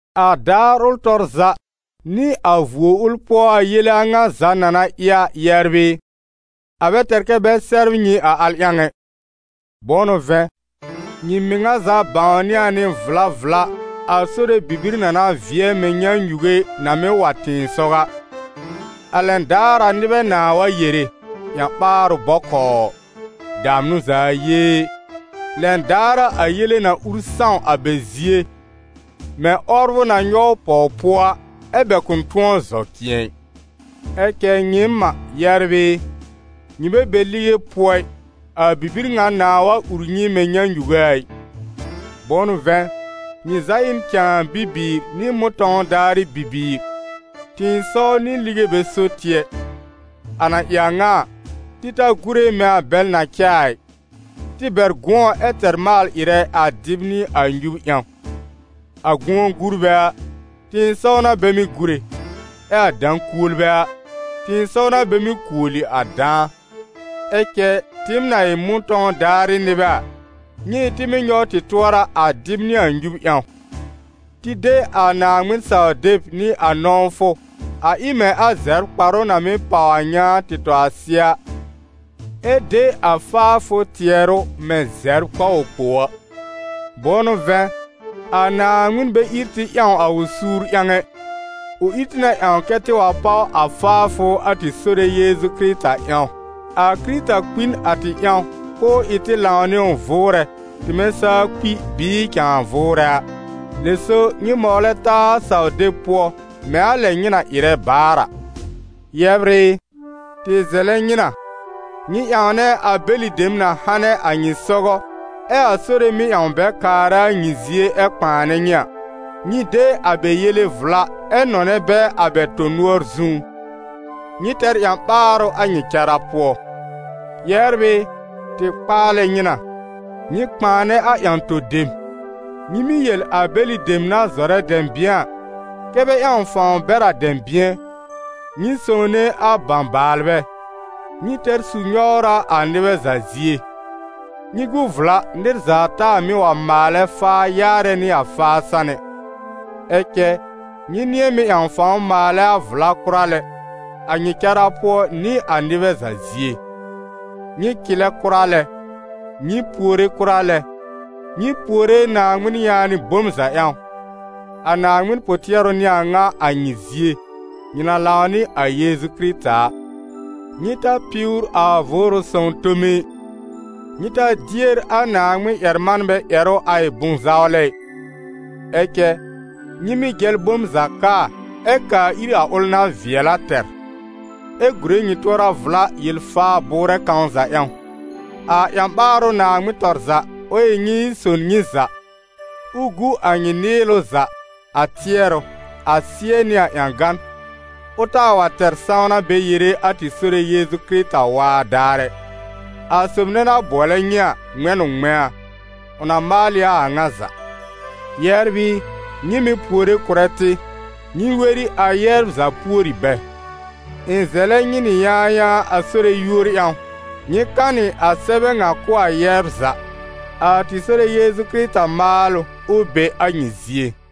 A daar ʋl tɔr za, nɩ a vuo ʋl pʋɔ a yele a ŋa za na na ɩ a, yɛbr ɩ, a bɛ tɛr kɛ́ bɛ sɛbr nyɩ a al ƴãw ɛ. Bʋ̃ʋ n'ʋ vɛ̃, nyɩ mɩŋa za bãwnɩ a nɩ vla vla a Sore bibir na na vɩɛ mɛ̃ nyãnyuge na mɩ́ wa tɩ̃ɩsɔw a. A lɛn daar a nɩbɛ nãà wa yere: «Ƴã-ɓaarʋ bɔkɔɔ! Damnʋ za yee!» Lɛn daar a a yele na ur sãw a bɛ zie mɛ̃ 'wɔbrʋ na nyɔw pɔw-pʋɔ a, ɛ́ bɛ kʋ̃ tʋ̃ɔ zɔ cɩ̃ɛ ɩ. Ɛ cɛ nyɩɩm a, yɛbr ɩ, nyɩ bɛ be lige pʋɔ ɩ, a bibir ŋa nãà wa ur nyɩ mɛ̃ nyãnyuge a ɩ. Bʋ̃ʋ n'ʋ vɛ̃, nyɩ za ɩ n cãa bibiir nɩ mʋ̃tɔ̃w daarɩ bibiir, tɩ̃ɩsɔw nɩ lige bɛ so tɩ ɛ. A na ɩ a ŋa a, tɩ ta gúre mɛ̃ a bɛl na cɛ a ɩ, tɩ bɛr gʋ̃ɔ ɛ tɛr maal-ɩrɛ a dɩb nɩ a nyub ƴãw. A gʋ̃ɔ-gurbɛ a, tɩ̃ɩsɔw n'a bɛ mɩ́ gúre, ɛ a dã-kuolbɛ a, tɩ̃ɩsɔw n'a bɛ mɩ́ kuoli a dãa. Ɛ cɛ tɩɩm na ɩ mʋ̃tɔ̃w daarɩ nɩbɛ a, nyɩ ɩ tɩ mɩ́ nyɔw tɩ tʋɔra a dɩb nɩ a nyub ƴãw. Tɩ de a Naaŋmɩn-saw-deb nɩ a nɔ̃wfʋ a ɩ mɛ̃ a zɛbr-kparʋ na mɩ́ pàw a nyãá tɩ tɔ a sɩɛ a, ɛ de a faafʋ tɩɛrʋ mɛ̃ zɛbr kpawɔ-kpow a. Bʋ̃ʋ n'ʋ vɛ̃, a Naaŋmɩn bɛ ír tɩ ƴãw a ʋ suur ƴãw ɛ, ʋ ír tɩ na ƴãw kɛ́ tɩ wa páw a faafʋ a tɩ Sore Yeezu Kɩrɩta ƴãw. A Kɩrɩta kpi n a tɩ ƴãw k'ʋʋ ɩ tɩ lãw nɩ ʋ vʋʋrɛ, tɩmɛ saa kpi bɩɩ cãa vʋʋrɛ a. Lɛ so nyɩ mɔwlɛ taa a saw-deb pʋɔ, mɛ̃ a lɛ nyɩ na ɩrɛ baar a. Yɛbr ɩ, tɩ zɛlɛ nyɩ na, nyɩ ƴãwnɛ a bɛlɩ dem na hanɛ a nyɩ sɔgɔ, ɛ a Sore mɩ́ ƴãw bɛ kaarɛ a nyɩ zie ɛ kpãanɛ nyɩ a. Nyɩ de a bɛ yele vla, ɛ nɔnɛ bɛ a bɛ tõ-nʋɔr zũú. Nyɩ tɛr ƴã-ɓaarʋ a nyɩ cara pʋɔ. Yɛbr ɩ, tɩ kpaalɛ nyɩ na: nyɩ kpãanɛ a ƴã-to-dem, nyɩ mɩ́ yel a bɛlɩ dem na zɔrɛ dɛ̃bɩ̃ɛ a, kɛ́ bɛ ƴãw fãw bɛr a dɛ̃bɩ̃ɛ, nyɩ sõwne a bãbaalbɛ, nyɩ tɛr su-nyɔwra a nɩbɛ za zie. Nyɩ gu vla, nɩr za taa mɩ́ wa maalɛ faa ƴaarɛ nɩ a faa san ɛ. Ɛ cɛ nyɩ nɩ̃ɛ mɩ́ ƴãw fãw maalɛ a vla kʋra lɛ, a nyɩ cara pʋɔ nɩ a nɩbɛ za zie. Nyɩ cɩlɛ kʋra lɛ, nyɩ puore kʋra lɛ, nyɩ puore Naaŋmɩn yaanɩ bom za ƴãw; a Naaŋmɩn pʋ-tɩɛrʋ n'ɩ a ŋa a nyɩ zie, nyɩ na lãw nɩ a Yeezu Kɩrɩta a. Nyɩ ta piwr a Vʋʋrʋ Sõw tome ɩ; nyɩ ta dier a Naaŋmɩn ƴɛr-manbɛ ƴɛrʋ a ɩ bʋ̃-zawlɛ ɩ. Ɛ cɛ, nyɩ mɩ́ jɛl bom za kaa ɛ kaa ir a ʋl na vɩɛl a tɛr, ɛ gùre nyɩ tʋɔra vla yel-faa-bʋʋrɛ kãw za ƴãw. A ƴã-ɓaarʋ Naaŋmɩn tɔr za, ʋ ɩ nyɩ ɩ son nyɩ za, ʋ gu a nyɩ nɩɩlʋ za, a tɩɛrʋ, a sɩ́ɛ nɩ a ƴãgan, ʋ taa wa tɛr sãwna bɛ yere a tɩ Sore Yeezu Kɩrɩta waa daar ɛ. A sob nɛ na bʋɔlɛ nyɩ a, ŋmɛ̃ n ʋ ŋmɛ̃a, ʋ na maal ɩ a a ŋa za. Yɛbr ɩ, nyɩ mɩ̀ puore kʋ̀rɛ tɩ. Nyɩ weri a yɛbr za pùori bɛ. Ɩ̃ zɛlɛ nyɩ nɩ yãayãa a Sore yúor ƴãw, nyɩ kanɩ a sɛbɛ ŋa kʋ̀ a yɛbr za. A tɩ Sore Yeezu Kɩrɩta maalʋ, ʋ be a nyɩ zie.